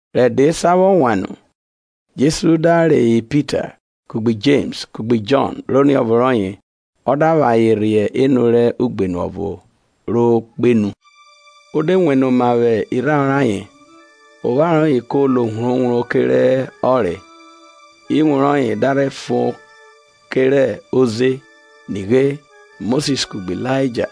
Rẹ ẹdẹ esan vwọ wan nu, Jesu da reyọ Pita, kugbe Jems, kugbe Jọn rẹ oniọvo rọye, ọ da vwẹ ayen rhe enu rẹ ugbenu ọvo ro kpenu. O de wene oma vwẹ irharo rẹ ayen; opharo rọye ko lo wrowro kerẹ ọnre, iwun rọye da rhe fon kerẹ oze. Nighe, Mosis kugbe Ilaija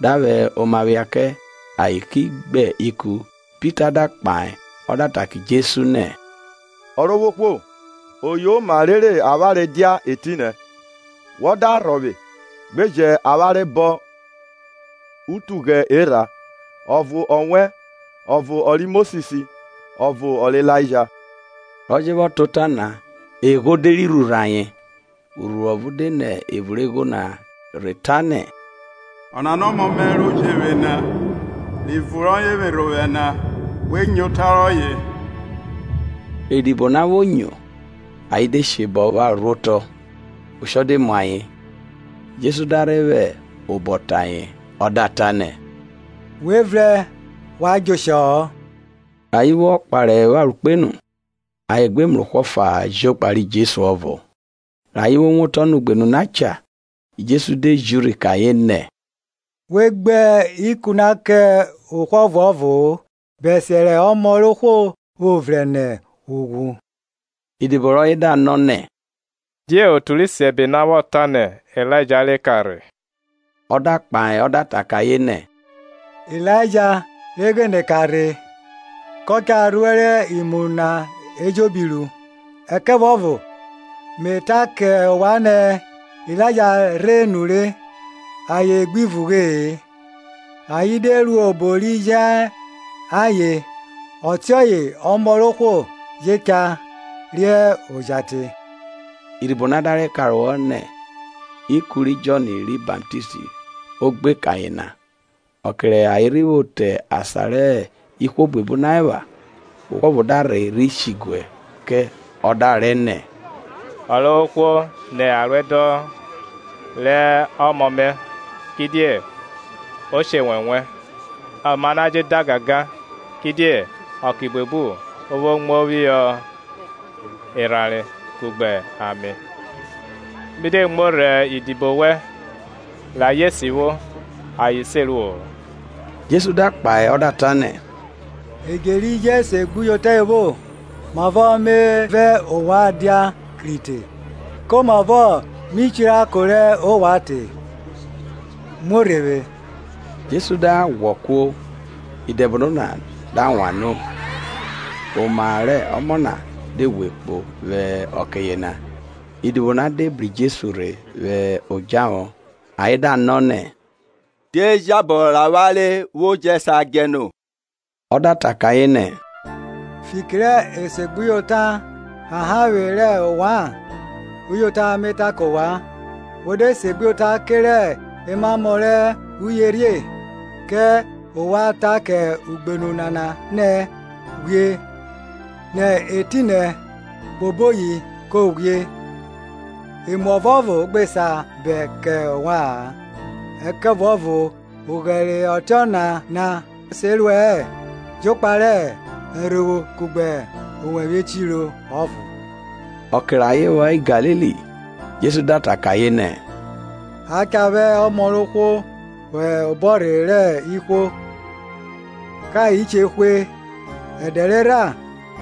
da vwẹ oma phia kẹ, ayen ki gbe ikun. Pita da kpahe ọ da kẹ Jesu nẹ, Ọrovwohwo, Oyoma rere avwanre dia etinẹ; wọ da rhọvwe, gbe jẹn avwanre bọn itughẹ erha, ọvo ọ wẹ, ọvo ọ ri Mosis, ọvo ọ rẹ Ilaija. Rọ je vwọ ta ota na, egho de rhi rhurhn ayen; urhuru ọvo de nẹ evun rẹ egho na rhe ta nẹ, Ọnana hẹ ọmọ mẹ ro je vwe na, rẹ ivun rọye vwerha ovwẹ na; we nyo ota rọye. Rẹ idibo na vwo nyo, ayen de she bọnvwọn opharo rhuotọ, oshọ de mu ayen. Jesu da rhe vwẹ obọ te ayen ọ da ta nẹ, We vrẹn, wa djẹ oshọ-ọ. Rẹ ayen vwọ kpare opharo kpenu, ayen gbe mrẹ ohwo ọfa-a jokpa ri Jesu ọvo. Rẹ ayen vwo wotọ nẹ ugbenu na cha, Jesu de ji urhi kẹ ayen nẹ, We gbe ikun na kẹ ohwo ọvuọvo-o, bẹsiẹ rẹ ọmọ rẹ ohwo vwo vrẹn nẹ ughwu. Idibo rọye da nọ nẹ, die otu rẹ isiẹbe na vwọ ta nẹ, Ilaija re ka rhe? Ọ da kpahe o da ta kẹ ayen nẹ, Ilaija re ghene ka rhe, kọ cha rhuẹrẹ imu na eje ruẹ. Ẹkẹvuọvo me ta kẹ ovwan nẹ, Ilaija rhe nure, ayen gbi vugbe-e; ayen de ruo obo ri je ayen, Ọtiọye Ọmọ rẹ ohwo je cha re oja te. Idibo na da rhe karohọ nẹ, ikun ri Jọn ri Baptist o gbe kẹ ayen na. Ọke rẹ ayen rhi vwo te asan rẹ ihwo buebu na epha, Ohwo ọvo da rhe rhi shiguẹ vwẹ obaro rọye ọ da rẹ nẹ, Ọrovwohwo ni aruẹdọn rẹ ọmọ mẹ; kidie o she enwẹnwẹ, oma na je da gangan; kidie ọke buebu o vwo muo phihọ erhanre kugbe ame. Mi de muo rhe idibo wẹn re ayen sivwo, ayen se ruo-o. Jesu da kpahe ọ da ta nẹ, Edje ri jẹ esegbuyota evwo, mavọ me vẹ ovwan dia kir te? Komavọ mi chirako rẹ ovwan te? muo rhe vwe. Jesu da ghwọ kuo, idẹbono na da wan no; oma rẹ ọmọ na de ghwe kpo vwẹ ọke yena. Idibo na de bru Jesu rhe vwẹ odjahọ, ayen da nọ nẹ; Die jabọ rẹ avwanre vwo jẹ sa djẹ no? Ọ da ta kẹ ayen nẹ, fiki rẹ esegbuyota ọhanhanvwe rẹ ovwan na. Uyota me ta kẹ ovwan, We de segbuyota kerẹ emamọ rẹ uyerhie, kẹ ovwan ta kẹ ugbenu nana nẹ, Ghwie nẹ etinẹ kpo oboyi; ko ghwie; emu ọvuọvo gbe sa bẹn kẹ ovwa-an. Ẹkẹvuọvo oghẹre ọtiọna na se ruẹ-ẹ, jokpa rẹ ẹrhovwo kugbe owẹvwe echiro ọvo. Ọke rẹ ayen vwọ hẹ Galili, Jesu da ta kẹ ayen nẹ, A cha vwẹ Ọmọ rẹ ohwo vwọ hẹ obọ rẹ ihwo. Kẹ ayen che hwe, ẹdẹ rerha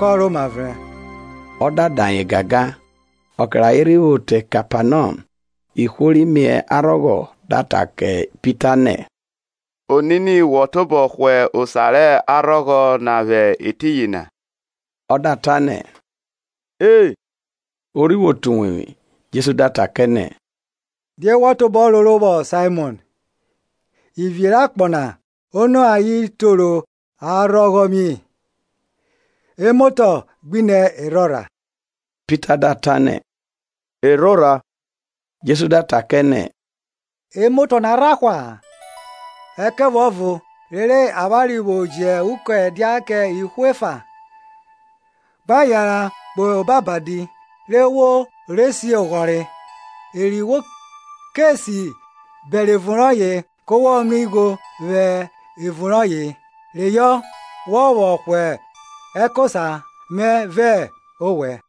kọ rhoma vrẹn. Ọ da da ayen gangan. Ọke rẹ ayen rhi vwo te Kepanọm, ihwo ri mie arhọghọ da ta kẹ Pita nẹ, Onini wẹn tobọ hwa osa rẹ arhọghọ rọye na? Ọ da ta nẹ, E. O rhi vwo te uwevwi, Jesu da ta kẹ nẹ, Die wọ tobọ roro vwọ Saimọn? Ivie rẹ akpọ na, ono ayen toro arhọghọ mie? emotọ gbinẹ erhorha? Pita da ta nẹ, Erhorha; Jesu da ta kẹ nẹ, emotọ na rha hwa?. Ẹkẹvuọvo rere avwanre vwo jẹ ukọn ẹdia kẹ ihwo efa, gba yanran kpo obo abadi, re wo re si oghọre, eri wo ke si bẹre evun rọye ke wọ mrẹ igho vwẹ evun rọye, reyọ wọ vwọ hwa ẹkosa mẹ vẹ ọwẹ.